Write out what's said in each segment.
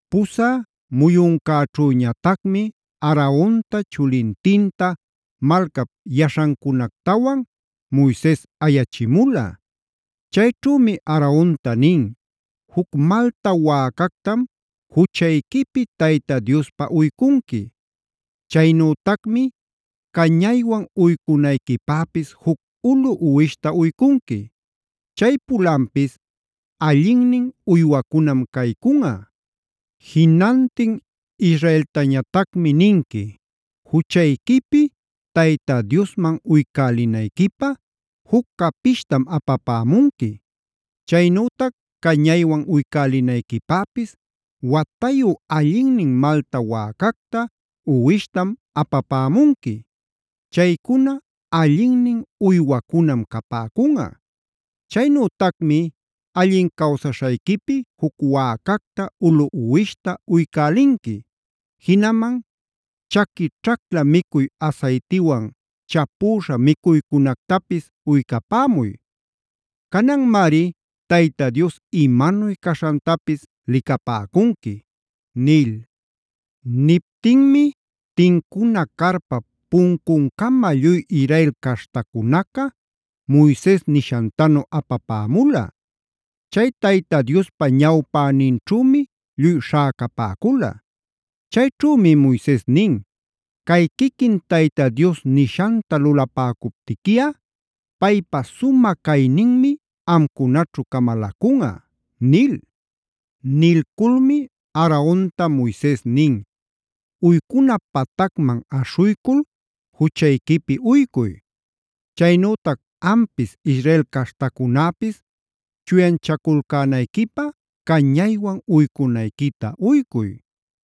Pusä muyuncäćhüñatacmi Aaronta, chulintinta, malcap yaśhancunactawan Moises ayachimula. Chayćhümi Aaronta nin: “Juc malta wäcactam juchayquipi Tayta Diospä uycunqui. Chaynütacmi cañaywan uycunayquipäpis juc ulu uwishta uycunqui. Chay pulanpis allinnin uywacunam caycunꞌa. Jinantin Israeltañatacmi ninqui: ‘Juchayquipi Tayta Diosman uycälinayquipä juc capishtam apapämunqui. Chaynütac cañaywan uycälinayquipäpis watayu allinnin malta wäcacta, uwishtam apapämunqui. Chaycuna allinnin uywacunam capäcunꞌa. Chaynütacmi allin cawsaśhayquipi juc wäcacta, ulu uwishta uycälinqui. Jinaman chaqui ćhacla micuy asaytiwan chapüśha micuycunactapis uycapämuy. Cananmari Tayta Dios imanuy caśhantapis licapäcunqui’” nil. Niptinmi tincuna carpap puncuncama lluy Israel caśhtacunaca Moises nishantanu apapämula. Chay Tayta Diospa ñawpäninćhümi lluy śhäcapäcula. Chayćhümi Moises nin: “Cay quiquin Tayta Dios nishanta lulapäcuptiquiꞌa paypa sumä cayninmi amcunaćhu camalacunꞌa” nil. Nilculmi Aaronta Moises nin: “Uycuna patacman aśhuycul juchayquipi uycuy. Chaynütac ampis, Israel caśhtacunäpis chuyanchaculcänayquipä cañaywan uycunayquita uycuy.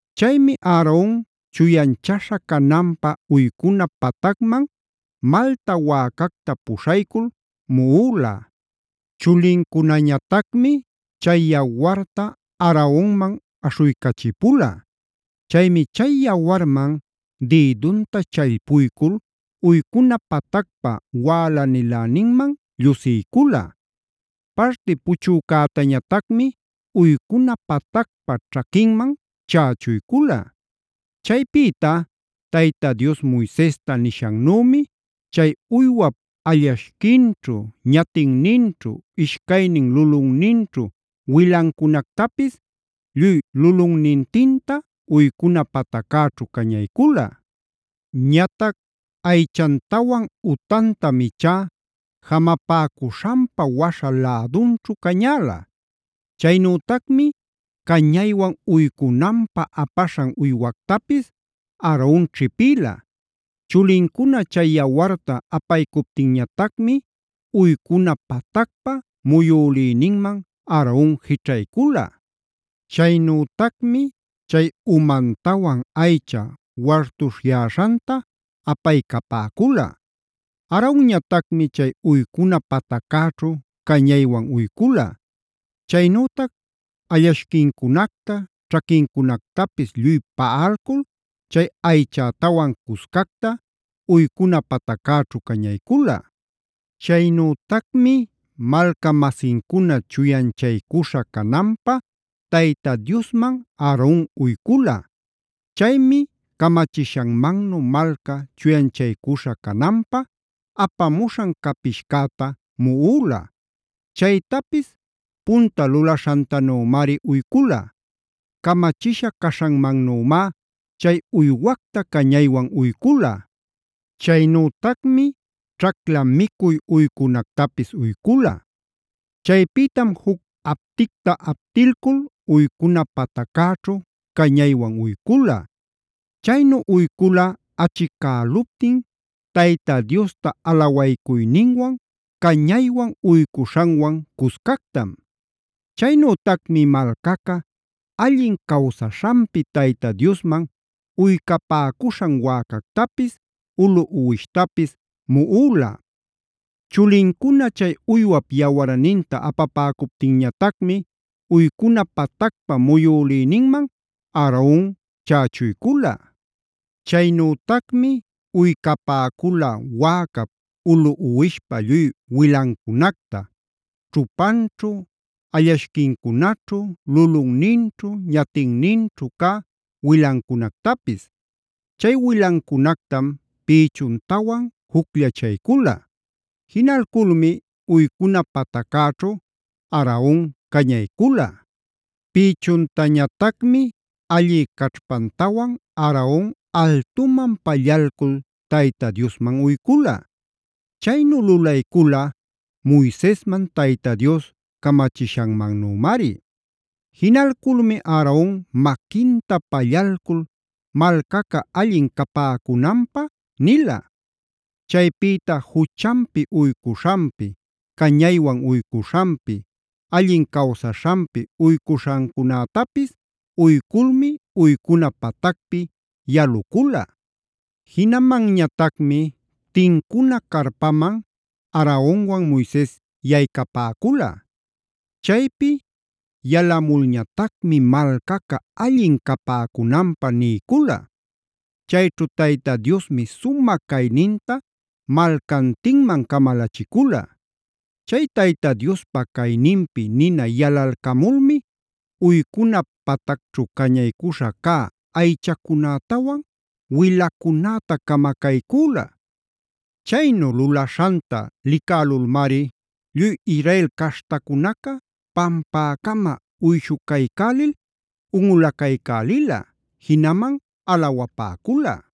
Chaymi Aaron chuyanchaśha cananpä uycuna patacman malta wäcacta puśhaycul muꞌula. Chulincunañatacmi chay yawarta Aaronman aśhuycachipula. Chaymi chay yawarman dïdunta challpuycul uycuna patacpa wälaniläninman llusiycula. Parti puchücätañatacmi uycuna patacpa ćhaquinman chächuycula. Chaypïta Tayta Dios Moisesta nishannümi chay uywap allashquinćhu, ñatinninćhu, ishcaynin lulunninćhu wilancunactapis lluy lulunnintinta, uycuna pataccäćhu cañaycula. Ñatac aychantawan utantam ichá jamapäcuśhanpa waśha lädunćhu cañäla. Chaynütacmi cañaywan uycunanpä apaśhan uywactapis Aaron ćhipïla. Chulincuna chay yawarta apaycuptinñatacmi uycuna patacpa muyülïninman Aaron jićhaycula. Chaynütacmi chay umantawan aycha wartuśhyäśhanta apaycapäcula. Aaronñatacmi chay uycuna pataccäćhu cañaywan uycula. Chaynütac allashquincunacta, ćhaquincunactapis lluy paꞌalcul chay aychätawan cuscacta uycuna pataccäćhu cañaycula. Chaynütacmi malca-masincuna chuyanchaycuśha cananpä Tayta Diosman Aaron uycula. Chaymi camachishanmannu malca chuyanchaycuśha cananpä apamuśhan capishcäta muꞌula. Chaytapis punta lulaśhantanümari uycula. Camachisha caśhanmannümá chay uywacta cañaywan uycula. Chaynütacmi ćhacla micuy uycunactapis uycula. Chaypïtam juc apticta aptilcul uycuna pataccäćhu cañaywan uycula. Chaynu uycula achicäluptin Tayta Diosta alawaycuyninwan cañaywan uycuśhanwan cuscactam. Chaynütacmi malcaca allin cawsaśhanpib Tayta Diosman uycapäcuśhan wäcactapis, ulu uwishtapis muꞌula. Chulincuna chay uywap yawarninta apapäcuptinñatacmi uycuna patacpa muyülïninman Aaron chächuycula. Chaynütacmi uycapäcula wäcap, ulu uwishpa lluy wilancunacta: ćhupanćhu, allashquincunaćhu, lulunninćhu, ñatinninćhu cä wilancunactapis. Chay wilancunactam pïchuntawan jucllachaycula. Jinalculmi uycuna pataccäćhu Aaron cañaycula. Pïchuntañatacmi allï caćhpantawan Aaron altuman pallalcul Tayta Diosman uycula. Chaynu lulaycula Moisesman Tayta Dios camachishanmannümari. Jinalculmi Aaron maquinta pallalcul malcaca allin capäcunanpä nila.c Chaypïta juchanpi uycuśhanpi, cañaywan uycuśhanpi, allin cawsaśhanpi uycuśhancunätapis uyculmi uycuna patacpi yalucula. Jinamanñatacmi tincuna carpaman Aaronwan Moises yaycapäcula. Chaypi yalamulñatacmi malcaca allin capäcunanpä niycula. Chayćhu Tayta Diosmi sumä cayninta malcantinman camalachicula. Chay Tayta Diospa cayninpi nina yalalcamulmi uycuna patacćhu cañaycuśha cä aychacunätawan, wilacunäta camacaycüla. Chaynu lulaśhanta licälulmari lluy Israel caśhtacunaca pampäcama uyshucaycälil unꞌulacaycälila, jinaman alawapäcula.